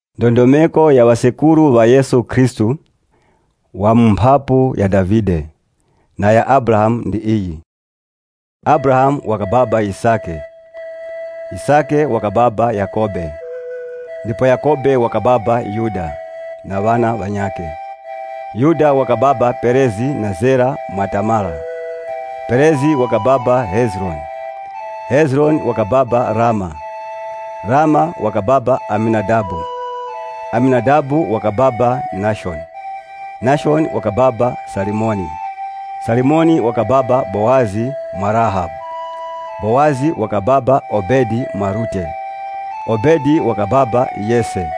Ndondomeko ya ŵasekuru ŵa Yesu Khristu, wa mu mphapu ya Davide, wa mu mphapu ya Abrahamu ndi iyi: Abrahamu wakababa Yisake, Yisake wakababa Yakhobe ndipo Yakhobe wakababa Yuda, na ŵabali ŵakhe. Yuda wakababa Perezi na Zera mwa Tamara, Perezi wakababa Hezironi, Hezironi wakababa Ramu, Ramu wakababa Aminadabu, Aminadabu wakababa Nashoni, Nashoni wakababa Salimoni, Salimoni wakababa Bowazi mwa Rahabu, Bowazi wakababa Obedi mwa Rute, Obedi wakababa Yese,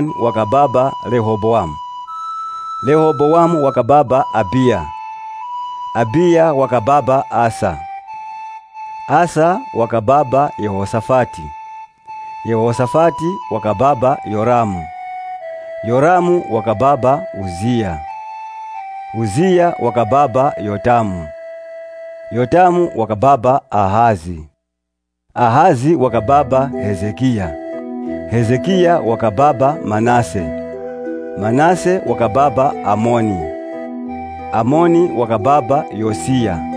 Solomoni wakababa Rehobowamu, Rehobowamu wakababa Abiya, Abiya wakababa Asa, Asa wakababa Yehoshafati, Yehoshafati wakababa Yoramu, Yoramu wakababa Uziya, Uziya wakababa Yotamu, Yotamu wakababa Ahazi, Ahazi wakababa Hezekiya, Hezekiya wakababa Manase, Manase wakababa Amoni, Amoni wakababa Yosiya,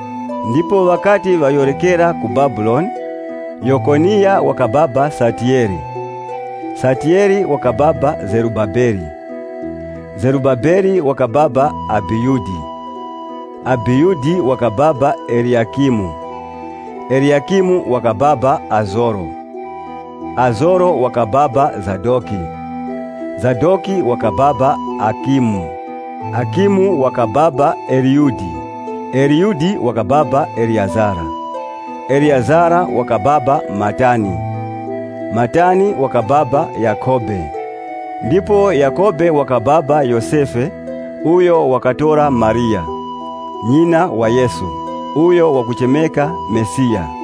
Ndipo ŵakati ŵayorekera ku Babuloni, Yokoniya wakababa Satiyele, Satiyele wakababa Zerubabele, Zerubabele wakababa Abiyudi, Abiyudi wakababa Eliyakimu, Eliyakimu wakababa Azoro. Azoro wakababa Zadoki, Zadoki wakababa Akimu, Akimu wakababa Eliyudi. Eliyudi wakababa Eleyazara, Eleyazara wakababa Matani, Matani wakababa Yakhobe, ndipo Yakhobe wakababa Yosefe uyo wakatora Mariya, nyina wa Yesu, uyo wakuchemeka Mesiya.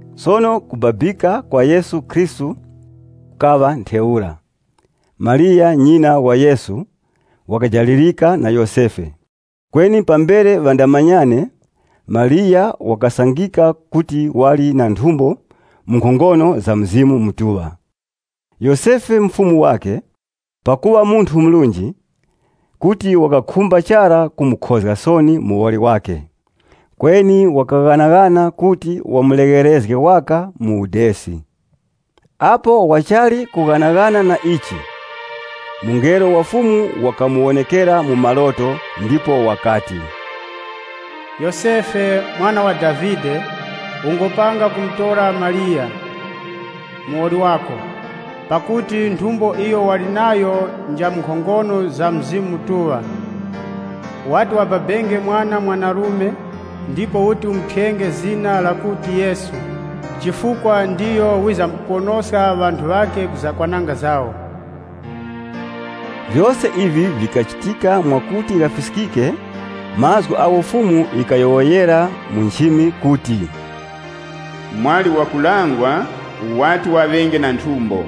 Sono kubabika kwa Yesu Khristu kukaŵa ntheura: Mariya nyina wa Yesu wakajalirika na Yosefe, kweni pambere ŵandamanyane, Mariya wakasangika kuti wali na nthumbo mu nkhongono za Mzimu Mutuŵa. Yosefe mufumu wakhe, pakuŵa munthu murunji, kuti wakakhumba chara kumukhozga soni muwoli wakhe. Kweni wakaghanaghana kuti wamulegherezge waka mu udesi. Apo wachali kughanaghana na ichi, mungelo wa Fumu wakamuwonekera mu maloto ndipo wakati, “Yosefe, mwana wa Davide, ungopanga kutora Mariya, muwoli wako. Pakuti nthumbo iyo wali nayo nja mu nkhongono za Mzimu Mutuŵa. Wati wababenge mwana mwanarume, ndipo uti umuthyenge zina lakuti Yesu, chifukwa ndiyo wizamkuponoska ŵanthu ŵakhe ku zakwananga zawo.” Vyose ivi vikachitika mwakuti ghafiskike mazgu agho Fumu yikayowoyera mu nchimi kuti, “Mwali wakulangwa wati waŵenge na nthumbo,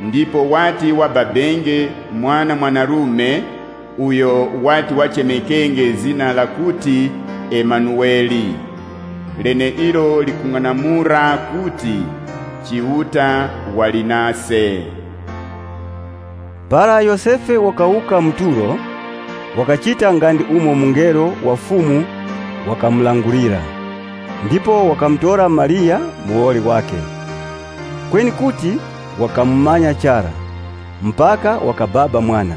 ndipo wati wababenge mwana mwanarume uyo wati wachemekenge zina lakuti Imanuwele” leneilo likung'anamula kuti, “Chiuta wali nase.” (LXX) Para Yosefe wakawuka mu tulo, wakachita nga ndi umo Mungelo wa Fumu wakamulangulira. Ndipo wakamutora Mariya, muwoli wakhe. Kweni kuti wakamumanya chara, mpaka wakababa mwana,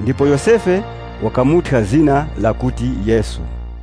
ndipo Yosefe wakamuthya zina lakuti Yesu.